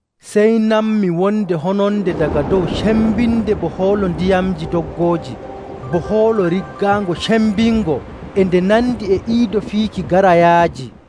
Sey nanmi wonde hononde daga dow cembinde bo hoolo ndiyamji doggooji, bo hoolo riggaango cembingo. E nde nandi e iido fiiki garaayaaji.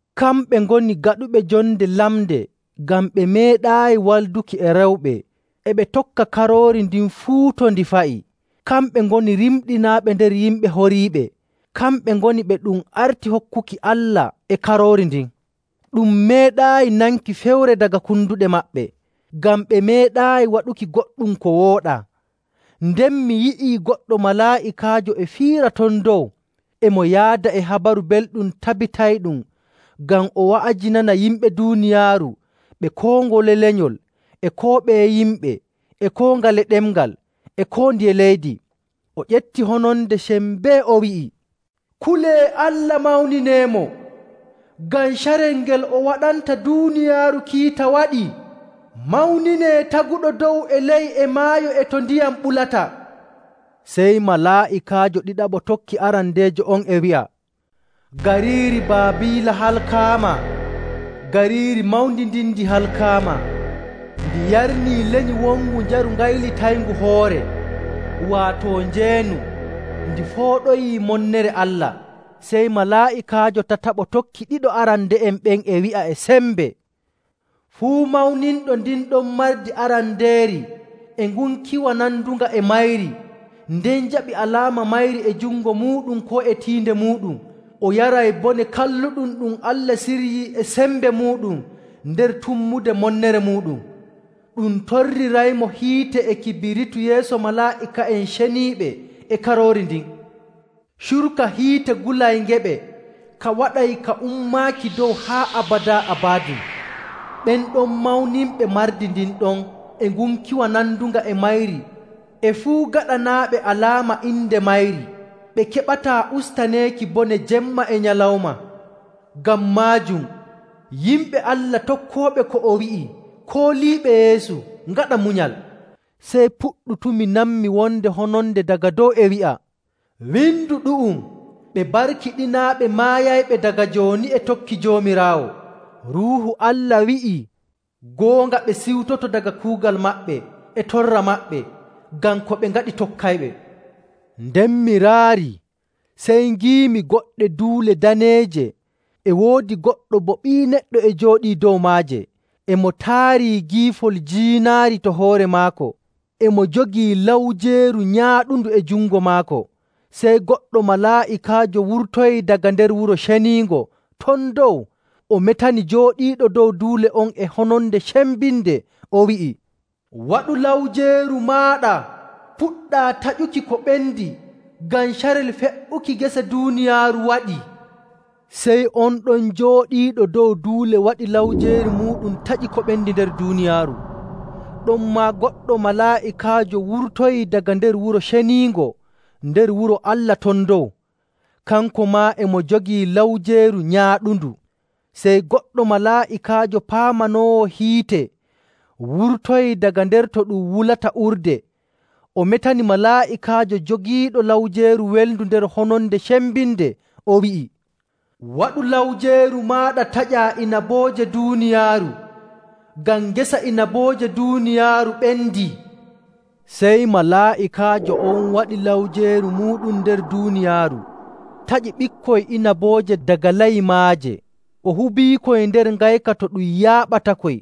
Kamɓe ngoni gaɗuɓe jonde lamnde ngam ɓe meeɗaayi walduki e rewɓe, e ɓe tokka Karoori ndin fuu to ndi fa'i. Kamɓe ngoni rimɗinaaɓe nder yimɓe horiiɓe, kamɓe ngoni ɓe ɗum arti hokkuki Allah e Karoori ndin. Ɗum meeɗaayi nanki fewre daga konduɗe maɓɓe, ngam ɓe meeɗaayi waɗuki goɗɗum ko wooɗaa. Nden mi yi'ii goɗɗo malaa'ikaajo e fiira ton dow, e mo yaada e Habaru Belɗum tabitayɗum ngam o wa'ajinana yimɓe duuniyaaru ɓe koo ngole lenyol, e koo ɓeye yimɓe, e koo ngale ɗemngal, e koo ndiye leydi. O ƴefti hononde sembee o wi'i, “Kulee Allah mawnineemo! Ngam carel ngel o waɗanta duuniyaaru kiita waɗii. Mawninee taguɗo dow e ley, e maayo e to ndiyam ɓulata.” Sey malaa'ikaajo ɗiɗaɓo tokki arandeejo on e wi'a, “Gariiri Baabiila halkaama! Gariiri mawndi ndin ndi halkaama! Ndi yarnii lenyi wongu njaru gaylitayngu hoore, waato njeenu, ndi fooɗoyi monnere Allah.” Sey malaa'ikaajo tataɓo tokki ɗiɗo arande'en ɓen e wi'a e sembe, “Fuu mawninɗo ndin ɗon mardi arandeeri e ngunkiwa nandunga e mayri, nden jaɓi alaama mayri e jungo muuɗum koo e tiinde muuɗum, o yaray bone kalluɗum ɗum Allah siryii e sembe muuɗum nder tummude monnere muuɗum. Ɗum torriraymo hiite e kibiritu yeeso malaa'ika'en ceniiɓe e Karoori ndin. Curka hiite gulayngeɓe ka waɗay ka ummaaki dow haa abadaa abadin. Ɓen ɗon mawninɓe mardi ndin ɗon e ngunkiwa nandunga e mayri e fuu gaɗanaaɓe alaama inde mayri, ɓe keɓataa ustaneeki bone jemma e nyalawma.” Ngam maajum yimɓe Allah tokkooɓe ko o wi'i kooliiɓe Yeesu ngaɗa munyal. Sey puɗɗutumi nanmi wonde hononde daga dow e wi'a, “Windu ɗu'um, ‘Ɓe barkiɗinaaɓe maayayɓe daga jooni e tokki Joomiraawo.’” Ruuhu Allah wi'ii, “Goonga, ɓe ciwtoto daga kuugal maɓɓe e torra maɓɓe, ngam ko ɓe ngaɗi tokkayɓe.” Nden mi raarii sey ngiimi goɗɗe duule daneeje e woodi goɗɗo bo Ɓii Neɗɗo e jooɗii dow maaje, e mo taari giifol jiinaari to hoore maako, e mo jogii lawjeeru nyaaɗundu e jungo maako. Sey goɗɗo malaa'ikaajo wurtoyii daga nder wuro ceniingo ton dow o metani jooɗiiɗo dow duule on e hononde cembinde o wi'i, “Waɗu lawjeeru maaɗa, puɗɗaa taƴuki ko ɓendi, ngam carel fe''uki gese duuniyaaru waɗii.” Sey on ɗon jooɗiiɗo dow duule waɗi lawjeeru muuɗum taƴi ko ɓendi nder duuniyaaru. Ɗonmaa goɗɗo malaa'ikaajo wurtoyii daga nder wuro ceniingo nder wuro Allah ton dow. Kanko maa e mo jogii lawjeeru nyaaɗundu. Sey goɗɗo malaa'ikaajo paamanoowo hiite wurtoyii daga nder to ɗum wulata urde. O metani malaa'ikaajo jogiiɗo lawjeeru welndu nder hononde cembinde o wi'i, “Waɗu lawjeeru maaɗa taƴaa inabooje duuniyaaru, ngam ngesa inabooje duuniyaaru ɓendii.” Sey malaa'ikaajo on waɗi lawjeeru muuɗum nder duuniyaaru taƴi ɓikkoy inabooje daga layi maaje, o hubiikoy nder ngayka to ɗum yaaɓatakoy.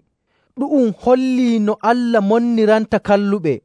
Ɗu'um holli no Allah monniranta kalluɓe.